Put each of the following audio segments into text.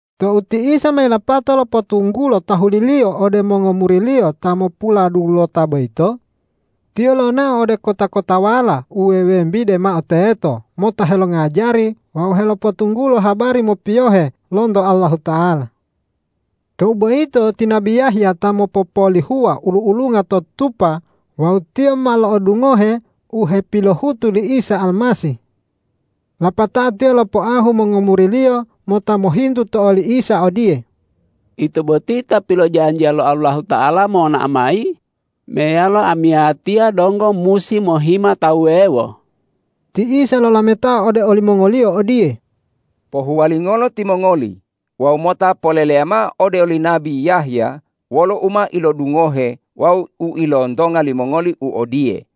Tou ti Isa ma yilapato lopotunggulo tahuli-Liyo ode mongomuri-Liyo ta mopuladulota boyito, Tiyo lonao ode kota-kotawala u wewembide mao teto mota helongajari wawu helopotunggulo habari mopiyohe lonto Allahuta'ala. Tou boyito ti nabi Yahya ta mopopolihuwa ulu-ulunga to tutupa wawu tiyo ma lo'odungohe u hepilohutu li Isa Almasih. Lapatao tiyo lopoahu mongomuriliyo mota mohintu to oli Isa odiye,”Ito boti Ta pilojanjiya lo Allahuta'ala monao mayi meyalo amiyatiya donggo musi mohima tawu wuwewo?” Ti Isa lolametao ode olimongoliyo odiye,”Pohuwalingolo timongoli wawu mota poleleya mao ode oli nabi Yahya wolo u ma ilodungohe wawu u ilontonga limongoli u odiye,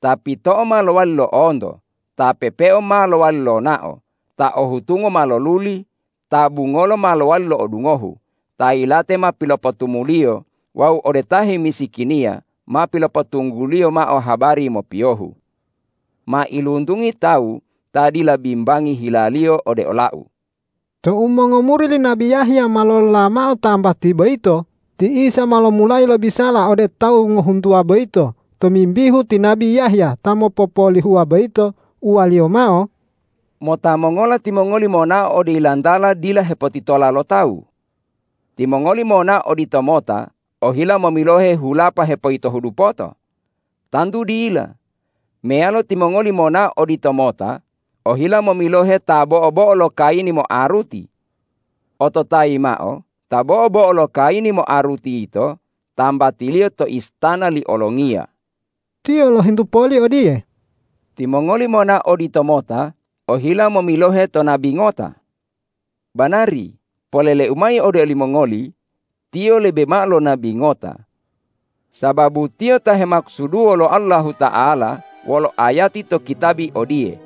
’Ta pito'o ma lowali lo'onto, ta pepeo ma lowali lonao, ta o hutungo ma loluli, ta bungolo ma lowali lo'odungohu, ta yilate ma pilopotumuliyo wawu ode ta hemisikiniya ma pilopotungguliyo mao habari mopiyohu.’ Mailuntungi tawu ta dila bimbangi hilaliyo ode ola-U.” Tou mongomuri li nabi Yahya ma lolola mao tambati boyito, ti Isa ma lomulayi lobisala ode tawu ngohuntuwa boyito tomimbihu ti nabi Yahya ta mopopolihuwa boyito. Uwa-Liyo mao,”Mota mongola timongoli monao ode yilantala dila hepotitola lo tawu? Timongoli monao oditomota ohila momilohe hulapa hepoyitohu dupoto? Tantu dila. Meyalo timongoli monao oditomota ohila momilohe ta bo'o-bo'o lo kayini moaruti? Ototayi mao, ta bo'o-bo'o lo kayini moaruti yito tambatiliyo to istana li olongiya.” Tiyo lohintu poli odiye,”Timongoli monao oditomota ohila momilohe to nabi ngota? Banari, polele-U mayi ode olimongoli, tiyo lebe mao lo nabi ngota. Sababu tiyo ta hemakusuduwo lo Allahuta'ala wolo ayati to kitabi odiye,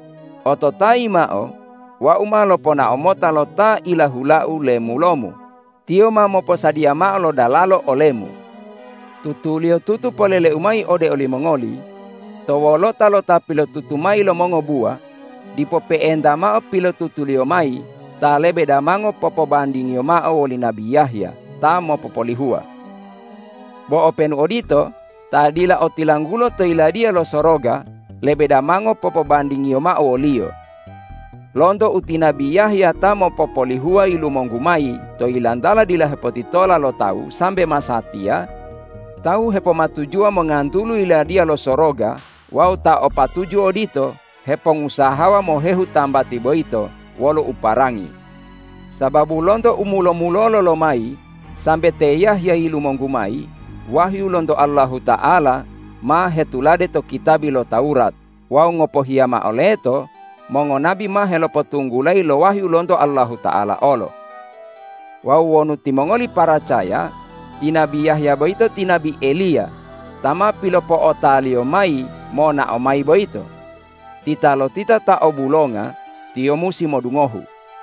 ’Ototayi mao: Wau ma loponao mota lo ta ilahula-U lemulo-Mu; tiyo ma moposadiya mao lo dalalo ole-Mu.’ Tutuliyotutu polele-U mayi ode olimongoli: To wolota lo ta pilotutu mayi lo mongobuwa dipo pe'enta mao pilotutuliyo mayi ta lebe damango popobandingiyo mao woli nabi Yahya ta mopopolihuwa. Bo openu odito, ta dila otilanggulo to Yiladiya lo Soroga lebe damango popobandingiyo mao woliyo. Lonto u ti nabi Yahya ta mopopolihuwa yilumonggu mayi to yilantala dila hepotitola lo tawu sambe masatiya, tawu hepomatujuwa mongantulu Yiladiya lo Soroga wawu ta o patuju odito hepongusahawa mohehu tambati boyito wolo uparangi. Sababu lonto u mulo-mulolo lomayi sambe te Yahya yilumonggu mayi, wahyu lonto Allahuta'ala ma hetulade to kitabi lo Tawurat wawu ngopohiya mao leto mongonabi ma helopotunggulayi lo wahyu lonto Allahuta'ala olo. Wawu wonu timongoli paracaya, ti nabi Yahya boyito ti nabi Eliya ta ma pilopo'otaliyo mayi monao mayi boyito. Titalotita ta o bulonga, tiyo musi modungohu!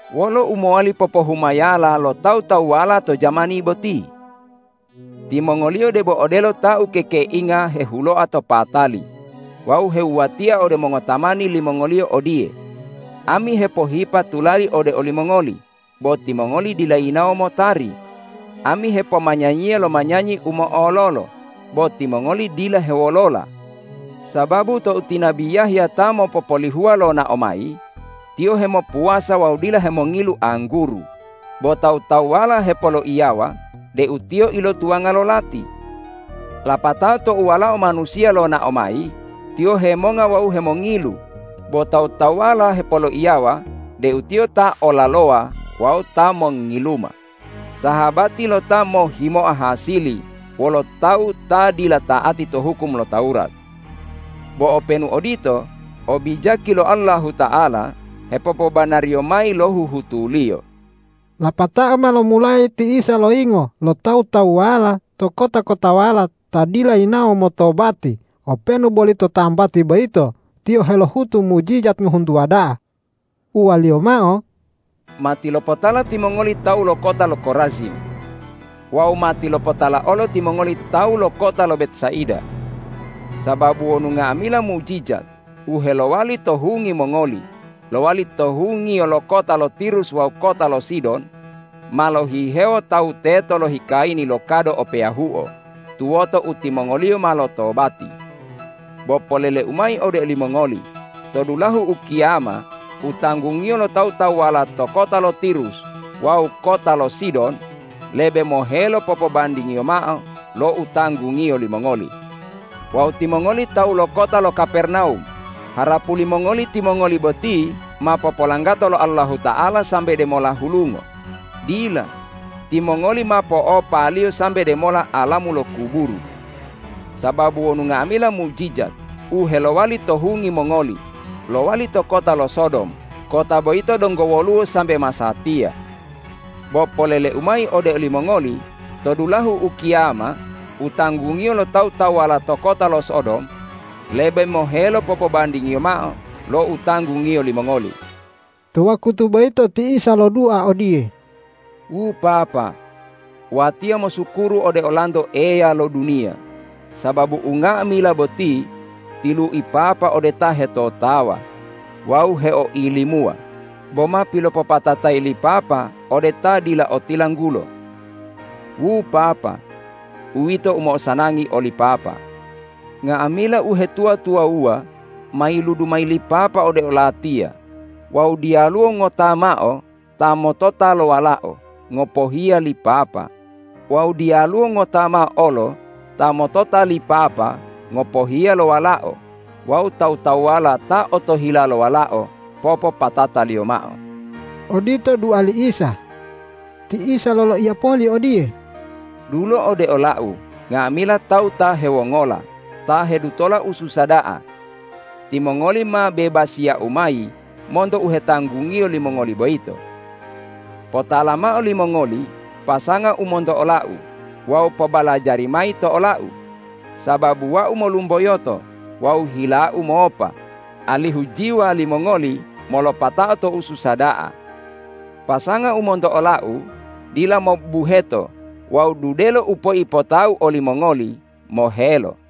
Wolo u mowali popohumayala lo tawu-tawuwala to jamani boti? Timongoliyo debo odelo ta ukekeinga hehuloa to patali wawu hewuwatia ode mongotamani limongoliyo odiye, ’Ami hepohipa tulali ode olimongoli, bo timongoli dila yinawo motari. Ami hepomanyanyiya lo manyanyi u mo'ololo, bo timongoli dila hewolola.’ Sababu tou ti nabi Yahya ta mopopolihuwa lonao mayi, tiyo hemopuwasa wawu dila hemongilu angguru, bo tawu-tawuwala hepoloiyawa deu tiyo ilotuwanga lo lati. Lapatao tou Walao Manusiya lonao mayi, Tiyo hemonga wawu hemongilu, bo tawu-tawuwala hepoloiyawa deu Tiyo ta olalowa wawu ta mongngiluma, sahabati lo ta mohhimoa hasili wolo tawu ta dila ta'ati to hukum lo Tawurat. Bo openu odito, obijaki lo Allahuta'ala hepopobanariyo mayi lo huhutu-Liyo.” Lapatao ma lomulayi ti Isa loyingo lo tawu-tawuwala to kota-kotawala ta dila yinawo motobati openu boli to tambati boyito Tiyo helohutu mujijat ngohuntuwa da'a. Uwa-liyo mao, ”Matilopotala timongoli tawu lo kota lo Korazim! Wawu matilopotala olo timongoli tawu lo kota lo Betsaida! Sababu wonu nga'amila mujijat u helowali to hungi mongoli lowali to hungiyo lo kota lo Tirus wawu kota lo Sidon, ma lohihewo tawu teto lohikayini lo kado o peyahuo tuwoto u timongoliyo ma lotobati. Bo polele-U mayi ode olimongoli: To dulahu ukiyama u tanggungiyo lo tawu-tawuwala to kota lo Tirus wawu kota lo Sidon lebe mohelo popobandingiyo mao lo utanggungiyo limongoli. Wawu timongoli tawu lo kota lo Kapernawum, harapu limongoli timongoli boti ma popolanggato lo Allahuta'ala sambe demola hulungo. Dila, timongoli ma po'opa-Liyo sambe demola alamu lo kuburu! Sababu wonu nga'amila mujijat u helowali to hungi mongoli lowali to kota lo Sodom, kota boyito donggo woluwo sambe masatiya. Bo polele-U mayi ode olimongoli: To dulahu ukiyama u tanggungiyo lo tawu-tawuwala to kota lo Sodom lebe mohelo popobandingiyo mao lo utanggungiyo limongoli.” To wakutu boyito ti Isa lodua odiye,”Wu Papa, Watiya mosukuru ode Olanto Eya lo duniya sababu unga'amila boti tilui Papa ode ta hetotawa wawu heoilimuwa bo ma pilopopatatayi li Papa ode ta dila otilanggulo. Wu Papa, uwito u mo'osanangi oli Papa. Nga'amila uhetuwa-tuwawuwa ma yiludu mayi li Papa ode o-Latiya wawu diyaluwo ngota mao ta motota lo Walao ngopohiya li Papa wawu diyaluwo ngota mao olo ta motota li Papa ngopohiya lo Walao wawu tawu-tawuwala ta otohila lo Walao popopatataliyo mao.” Odito dua li Isa. Ti Isa loloiya poli odiye,”Dulo ode ola-U nga'amila tawu ta hewongola, ta hedutola ususa da'a. Timongoli ma bebasiya-U mayi monto u hetanggungiyo limongoli boyito. Potala mao limongoli pasanga u monto ola-U wawu pobalajari mayi to ola-U, sababu Wau molumboyoto wawu hila-U mopa, alihu jiwa limongoli molopatao to ususa da'a. Pasanga u monto ola-U dila mobubuheto wawu dudelo u peipota-U olimongoli mohelo.”